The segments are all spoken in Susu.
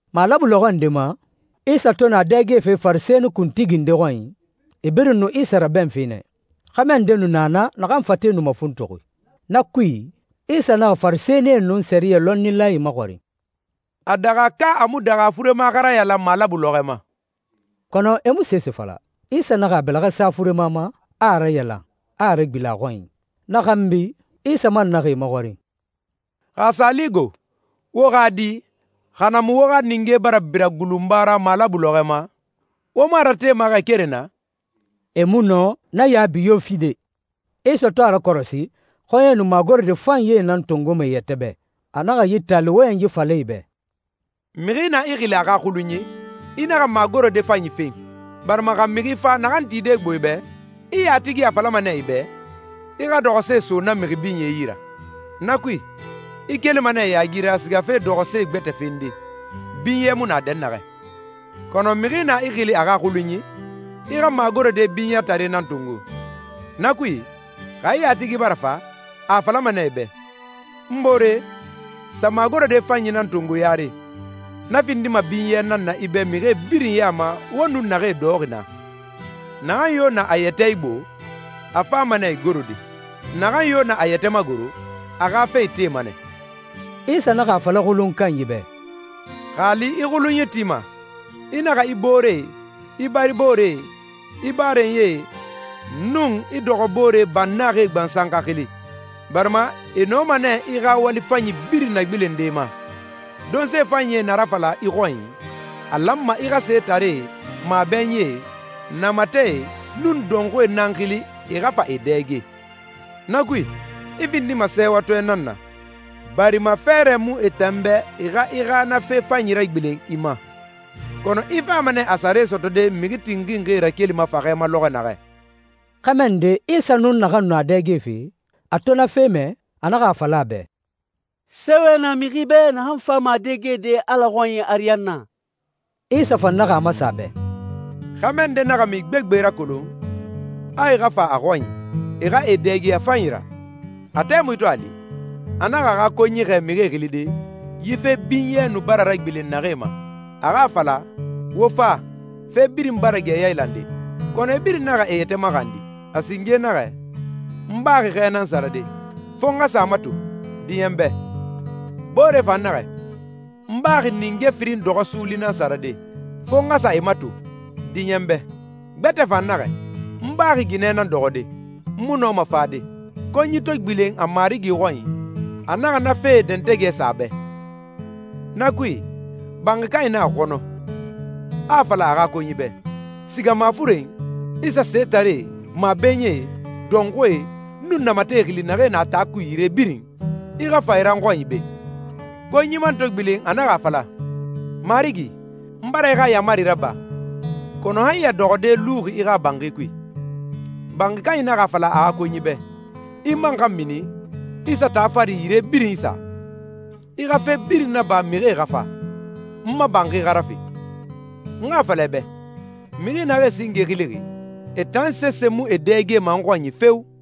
Malabu lɔxɔ nde ma, Isa to nu a dɛgefe Farisɛni kuntigi nde xɔnyi, e birin nu Isa rabɛnfe nɛ. Xɛmɛ nde nu na naa naxan fate nu mafuntuxi. Na kui, Isa naxa Farisɛnie nun sɛriyɛ lɔnnilae maxɔrin, «A daxa ka a mu daxa furema xa rayalan malabu lɔxɔɛ ma?» Kɔnɔ e mu sese fala. Isa naxa a bɛlɛxɛ sa furema ma, a a rayalan, a a ragbilen a xɔnyi. Na xanbi, Isa man naxa e maxɔrin, «Xa a sa li go, wo xa di, xa na mu wo xa ninge bara bira gulunba ra malabu lɔxɔɛ ma, wo mu a ratema xɛ keren na?» E mu nɔ na yaabi yo fide. Isa to a rakɔrɔsi xɔɲɛe nu magorode fanyie nan tongoma e yɛtɛ bɛ, a naxa yi taali wɔyɛnyi fala e bɛ, «Mixi na i xili a xa xulunyi, i naxa magorode fanyi fen, barima xa mixi fa naxan tide gbo i bɛ, i yatigi a falama nɛ i bɛ, ‹I xa dɔxɔse so na mixi binye yi ra.› Na kui, i kelima nɛ yaagi ra sigafe dɔxɔse gbɛtɛ fende, binyɛ mu na dɛnnaxɛ. Kɔnɔ mixi na i xili a xa xulunyi, i xa magorode binyɛtare nan tongo. Na kui, xa i yatigi bara fa, a a falama nɛ i bɛ, ‹N boore, sa magorode fanyi nan tongo yare.› Na findima binyɛ nan na i bɛ mixie birin ya ma wo nun naxee dɔxɔxi naa. Naxan yo na a yɛtɛ igbo, a fama nɛ igorode. Naxan yo na a yɛtɛ magoro, a xa fe itema nɛ.» Isa naxa a fala xulunyi kanyi bɛ, «Xa a li i xulunyi tima, i naxa i booree, i baribooree, i barenyie, nun i dɔxɔboore bannaxie gbansan xa xili, barima e nɔma nɛ i xa wali fanyi birin nagbilende i ma. Donse fanyie na rafala i xɔnyi, a lanma i xa setaree, mabɛnyie, namatɛe, nun dɔnxuie nan xili e xa fa e dɛge. Na kui, i findima sɛɛwatɔɛ nan na, barima fɛɛrɛ mu e tan bɛ e xa i xa na fe fanyi ragbilen i ma, kɔnɔ i fama nɛ a sare sɔtɔde mixi tinxinxie rakelima faxɛ ma lɔxɔ naxɛ.» Xɛmɛ nde Isa nun naxan nu a dɛgefe, a to na fe mɛ, a naxa a fala a bɛ, «Sɛɛwɛ na mixi bɛ naxan fama a dɛgede Ala xɔnyi ariyanna!» Isa fan naxa a masen a bɛ, «Xɛmɛ nde naxa mixi gbegbe rakolon, a e xa fa a xɔnyi, e xa e dɛge a fanyi ra. A tɛmui to a li, a naxa a xa konyi xɛɛ mixie xilide, yi fe binyɛ nu bara ragbilen naxee ma, a xa a fala, ‹Wo fa, fe birin bara gɛ yailande.› Kɔnɔ e birin naxa e yɛtɛ maxandi. A singe naxɛ, ‹N baxi xɛ nan sarade, fo n xa sa a mato. Diɲɛ n bɛ.› Boore fan naxɛ, ‹N baxi ninge firin dɔxɔ suuli nan sarade, fo n xa sa e mato. Diɲɛ n bɛ.› Gbɛtɛ fan naxɛ, ‹N baxi ginɛ nan dɔxɔde. N mu nɔma fade.›» «Konyi to gbilen a marigi xɔnyi, a naxa na fee dɛntɛgɛ sa a bɛ. Na kui, banxi kanyi naxa xɔnɔ, a a fala a xa konyi bɛ, ‹Siga mafuren, i sa setaree, mabɛnyie, dɔnxuie, nun namatɛe xili naxee na taa kui yire birin. I xa fa e ra n xɔnyi be.›» «Konyi man to gbilen a naxa a fala, ‹Marigi, n bara i xa yaamari raba, kɔnɔ han ya dɔxɔde luxi i xa banxi kui.› Banxi kanyi naxa a fala a xa konyi bɛ, ‹I man xa mini, i sa taa fari yire birin isa. I xa fe birin naba mixie xa fa, n ma banxi xa rafe. N xa a fala i bɛ, mixi naxee singe xilixi, e tan sese mu e dɛgema n xɔnyi feo!›»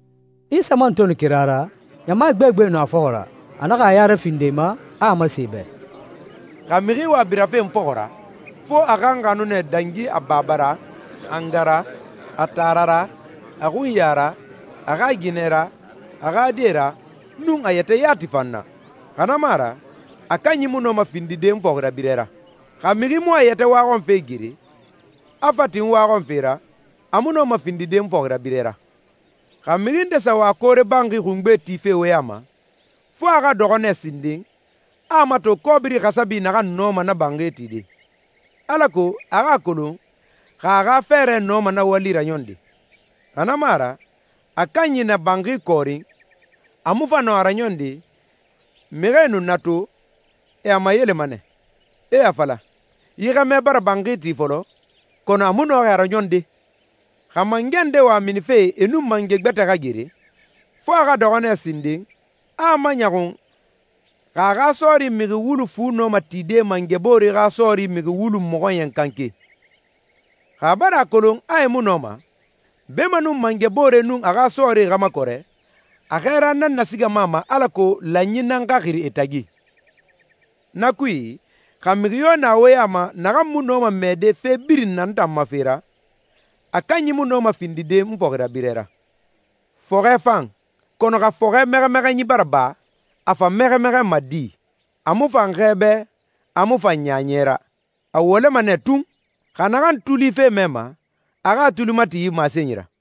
Isa man to nu kira ra, ɲama gbegbe nu a fɔxɔ ra. A naxa a ya rafindi e ma, a a masen e bɛ, «Xa mixi wa birafe n fɔxɔ ra, fo a xa n xanu nɛ dangi a baba ra, a nga ra, a taara ra, a xunya ra, a xa ginɛ ra, a xa die ra, nun a yɛtɛ yati fan na. Xa na mu a ra, a kanyi mu nɔma findide n fɔxirabirɛ ra. Xa mixi mu a yɛtɛ waxɔnfe gere, a fa tin n waxɔnfe ra, a mu nɔma findide n fɔxirabirɛ ra.» «Xa mixi nde sa wa koore banxi xungbe tife wo ya ma, fo a xa dɔxɔ nɛ sinden, a a mato kɔbiri xasabi naxan nɔma na banxi tide, alako a xa a kolon xa a xa fɛɛrɛ nɔma na wali raɲɔnde. Xa na mu a ra, a kanyi na banxi kɔɔrin a mu fa nɔ a raɲɔnde, mixie nu na to, e a mayelema nɛ, e a fala, ‹Yi xɛmɛ bara banxi ti fɔlɔ, kɔnɔ a mu nɔxi a raɲɔnde.›» «Xa mangɛ nde wa minife e nun mangɛ gbɛtɛ xa gere, fo a xa dɔxɔ nɛ sinden, a a maɲɔxun xa a xa sɔɔri mixi wulu fu nɔma tide mangɛ boore xa sɔɔri mixi wulu mɔxɔɲɛn kanke. Xa a bara a kolon a e mu nɔma, beemanun mangɛ boore nun a xa sɔɔrie xa makɔrɛ, a xɛɛra nan nasigama a ma alako lanyi nan xa xiri e tagi. Na kui, xa mixi yo na wo ya ma naxan mu nɔma mɛɛde fe birin na n tan ma fe ra, a kanyi mu nɔma findide n fɔxirabirɛ ra.» «Fɔxɛ fan, kɔnɔ xa fɔxɛ mɛxɛmɛxɛnyi bara ba, a fa mɛxɛmɛxɛnma di? A mu fan xɛ bɛ, a mu fan ɲaɲɛ ra. A wɔlɛma nɛ tun. Xa naxan tuli fe mɛma, a xa a tuli mati yi masenyi ra.»